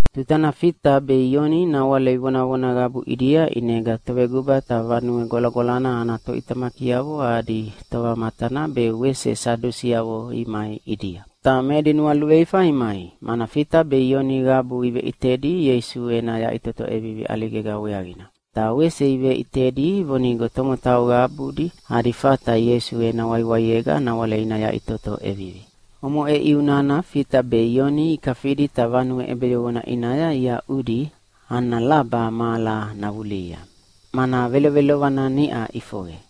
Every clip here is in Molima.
Tutana Fita be Ioni nawale ivonavona qabu ʼidia, ʼinega toveguba ta Vanue Gwalagwalana ana toʼitamakiavo adi tovamatana be wese Sadusiavo imai ʼidia. Ta me edi nualuveifa imai, mana Fita be Ioni qabu iveʼitedi Ieisu ena yaʼitoto ʼevivi ʼaligega weaqina. Ta wese iveʼitedi vonigo tomotau qabudi adi fata Ieisu ena waiwaiega nawale ina yaʼitoto ʼevivi. Omoʼe ʼiu nana Fita be Ioni ikafidi ta vanue ʼebeyoqona ʼinaya iaʼudi ana laba mahala navulihia, mana velovelovana niʼa ʼifoqe.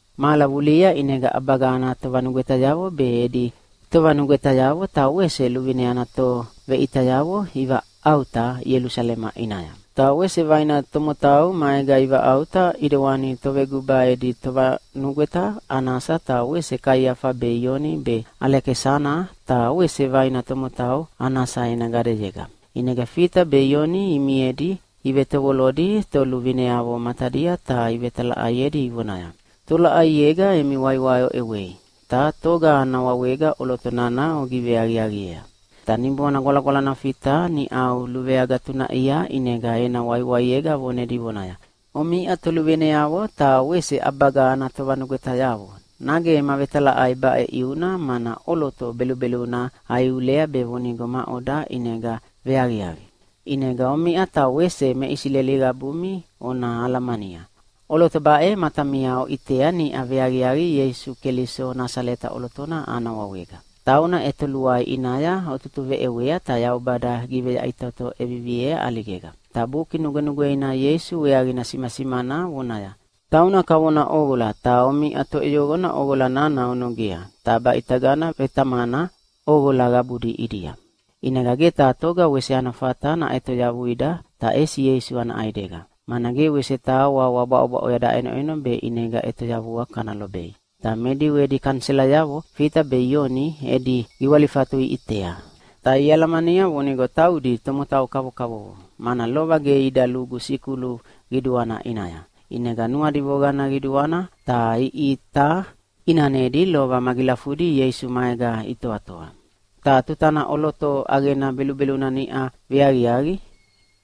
Mahala vulihia ʼinega ʼabaga ana tovanugwetayavo be edi tovanugwetayavo ta wese luvine ana toveʼitayavo ivaʼauta Ielusalema ʼinaya. Ta wese vaina tomotau maega ivaʼauta ʼidewani toveguba edi tovanugweta Anasa ta wese Kaiafa be Ioni be Alekisana ta wese vaina tomotau Anasa ena gadeyega. ʼInega Fita be Ioni imiedi ivetovolodi toluvineavo matadia ta ivetalaʼaiedi ivonaya, “Tolaʼaiega emi waiwai oʼewei, ta toga ana wawega ʼoloto nana ogiveaqiaqiea?” Ta Niboana Gwalagwalana Fita niʼau luveagatunaʼia, ʼinega ena waiwaiega vonedi vonaya, “Omiʼa toluvineavo ta wese ʼabaga ana tovanugwetayavo, nage ema vetalaʼai baʼe ʼiuna mana ʼoloto belubeluna aiulea be vonigo maʼoda ʼinega veaqiaqi? ʼInega omiʼa ta wese me Isileli qabumi ona alamania, ʼoloto baʼe matamia oʼitea niʼa veaqiaqi Ieisu Keliso Nasaleta ʼolotona ana wawega. Tauna ʼetoluai ʼinaya otutuveʼewea, ta Yaubada giveyaʼitoto ʼeviviea ʼaligega. Ta Buki Nugwenugweina Ieisu weaqina simasimana vonaya, ‘Tauna kavona ʼoqola, ta omiʼa toʼeyoqona ʼoqola nana onogea, ta baʼitagana vetamana ʼoqola qabudi ʼidia.’ ʼInega ge taha toga wese ana fata naʼetoyavuida ta ʼesi Ieisu ana ʼaidega. Mana ge wese taha wawa bwaʼobwaʼoya daʼenoʼeno be ʼinega ʼetoyavua kana lobei.” Ta me Diu edi kaniselayavo Fita be Ioni edi giwalifatu iʼitea. Ta ialamania vonigo taudi tomotau kavokavovo, mana lova ge ida lugu sikulu qiduana ʼinaya. ʼInega nuadi voqana qiduana ta iʼita ʼinanedi lova magilafudi Ieisu maega itoatoa. Ta tutana ʼoloto ʼaqena belubeluna niʼa veaqiaqi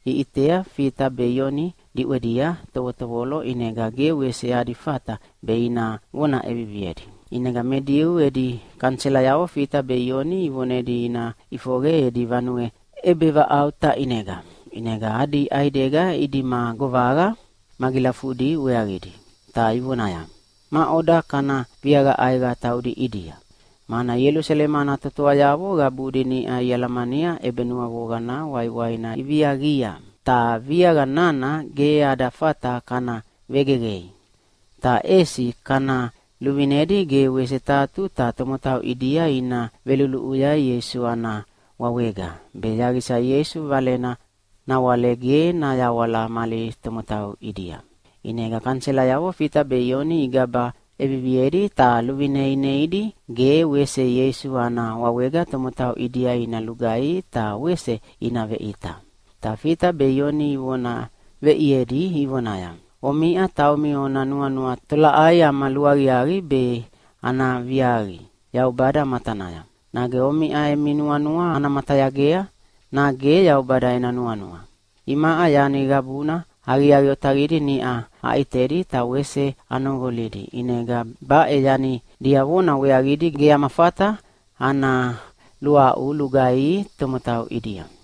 iʼitea Fita be Ioni diʼwedia tovotovolo, ʼinega ge wese adi fata be ina vona ʼeviviedi. ʼInega me Diu edi kaniselayavo Fita be Ioni ivonedi ina ʼifoqe edi vanue ʼebevaʼauta ʼinega, ʼinega adi ʼaidega idima govaqa magilafudi weaqidi. Ta ivonaya, “Maʼoda kana viaqa ʼaiqa taudi ʼidia? Mana Ielusalema ana totoayavo qabudi niʼa ialamania ʼebenuavoqana waiwaina iviaqia. Ta viaqa nana ge ada fata kana vegeqei. Ta ʼesi kana luvinedi ge wese taha tuta tomotau ʼidia ina veluluʼuya Ieisu ana wawega, be yaqisa Ieisu Valena nawale ge nayawala mali tomotau ʼidia.” ʼInega kaniselayavo Fita be Ioni igaba ʼeviviedi, ta luvine ineidi ge wese Ieisu ana wawega tomotau ʼidia ina lugaihi ta wese ina veʼita. Ta Fita be Ioni ivona veʼiedi ivonaya, “Omiʼa taumi ona nuanua tolaʼai ama luaqiaqi be ana viaqi Yaubada matanaya. Nage omiʼa emi nuanua ana matayagea, nage Yaubada ena nuanua? Imaʼa yani qabuna aqiaqi otaqidi niʼa aʼitedi ta wese anoqolidi, ʼinega baʼe yani diavona weaqidi ge ama fata ana luaʼu lugaihi tomotau ʼidia.”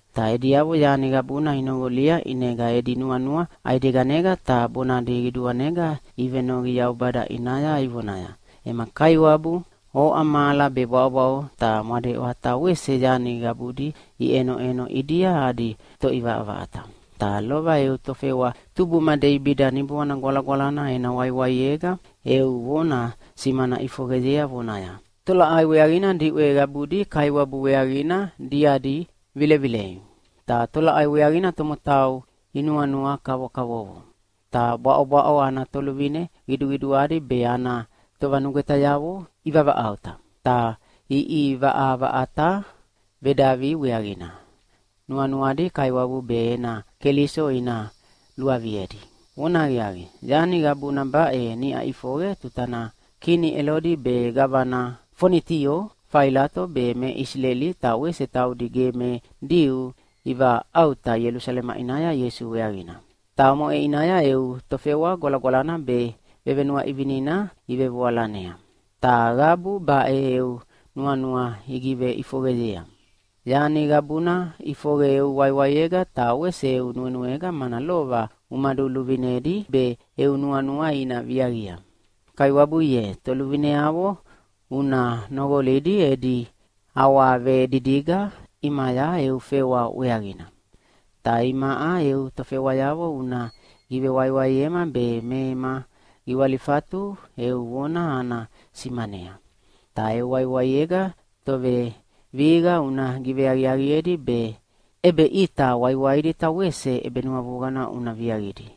Ta ediavo yani qabuna inoqolia ʼinega edi nuanua ʼaideganega ta bonadi qiduanega ivenoqi Yaubada ʼinaya ivonaya, “Ema Kaiwabu, oʼa mahala be bwaʼobwaʼo ta mwadeʼwa ta wese yani qabudi iʼenoʼeno ʼidia adi Toʼivaʼavaʼata, ta lova eu tofewa tubuma Deibida Niboana Gwalagwalana ena waiwaiega eu vona simana ʼifoqeyea vonaya, ‘Tolaʼai weaqina diʼwe qabudi Kaiwabu weaqina diadi vilevilei? Ta tolaʼai weaqina tomotau inuanua kavokavovo? Ta bwaʼobwaʼo ana toluvine qiduqiduadi be ana tovanugwetayavo ivavaʼauta ta iʼivaʼavaʼata vedavi weaqina, nuanuadi Kaiwabu be ena Keliso ina luaviedi.’ Vonahaqiaqi, yani qabuna baʼe niʼa ʼifoqe tutana kini Elodi be gavana Fonitio Failato be me Isileli ta wese taudi ge me Diu ivaʼauta Ielusalema ʼinaya Ieisu weaqina. Ta omoʼe ʼinaya eu tofewa Gwalagwalana be vevenuaʼivinina ivevoalanea. Ta qabu baʼe eu nuanua igiveʼifoqeyea. Yani qabuna ʼifoqe eu waiwaiega ta wese eu nuenuega, mana lova umaduluvinedi be eu nuanua ina viaqia. Kaiwabu ye, toluvineavo una noqolidi edi awavedidiga ʼimaya eu fewa weaqina. Ta imaʼa eu tofewayavo una givewaiwaiema be me ema giwalifatu eu vona ana simanea. Ta eu waiwaiega tovevihiqa una giveaqiaqiedi be ʼebeʼita waiwaidi ta wese ʼebenuavoqana una viaqidi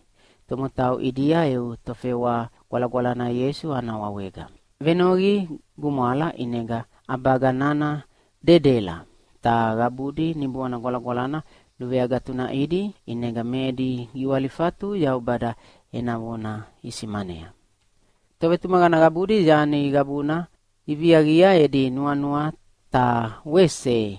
tomotau ʼidia eu tofewa Gwalagwalana Ieisu ana wawega.” Venoqi gumwala ʼinega ʼabaga nana dedela. Ta qabudi Niboana Gwalagwala luveagatunaʼidi, ʼinega me edi giwalifatu Yaubada ena vona isimanea. Tovetumaqana qabudi yani qabuna iviaqia edi nuanua ta wese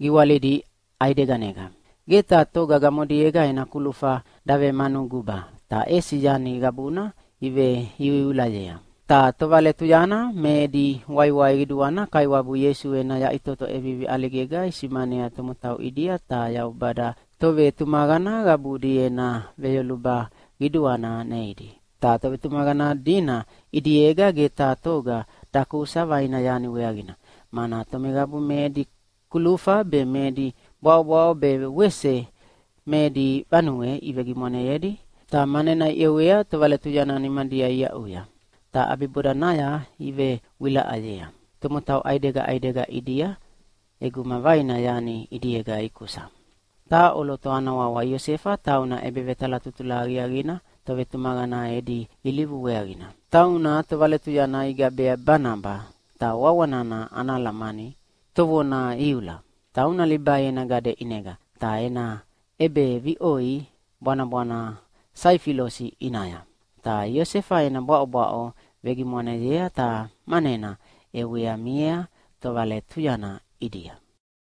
giwalidi ʼaideganega. Ge taha toga gamodiega ena kulufa davemanu guba, ta ʼesi yani qabuna iveiuiulayea. Ta tovaletuyana me edi waiwai qiduana Kaiwabu Ieisu ena yaʼitoto ʼevivi ʼaligega isimanea tomotau ʼidia, ta Yaubada tovetumaqana qabudi ena veyoluba qiduana neidi. Ta tovetumaqana dina ʼidiega ge taha toga dakusa vaina yani weaqina, mana tomeqabu me edi kulufa be me edi bwaʼobwaʼo be wese me edi vanue ivegimwaneyedi, ta manena iʼewea tovaletuyana nimadia iaʼuya. Ta ʼabibodanaya ivewilaʼayea tomotau ʼaidega ʼaidega ʼidia ʼeguma vaina yani ʼidiega ikusa. Taha ʼoloto ana wawa Iosefa tauna ʼebevetalatutula aqiaqina tovetumaqana edi ilivu weaqina. Tauna tovaletuyana igabea Banaba (ta wawa nana ana alamani, “Tovona iula”). Tauna Libai ena gade ʼinega, ta ena ʼebeviʼoi bwanabwana Saifilosi ʼinaya. Ta Iosefa ena bwaʼobwaʼo vegimwaneyea ta manena ʼewea miea tovaletuyana ʼidia.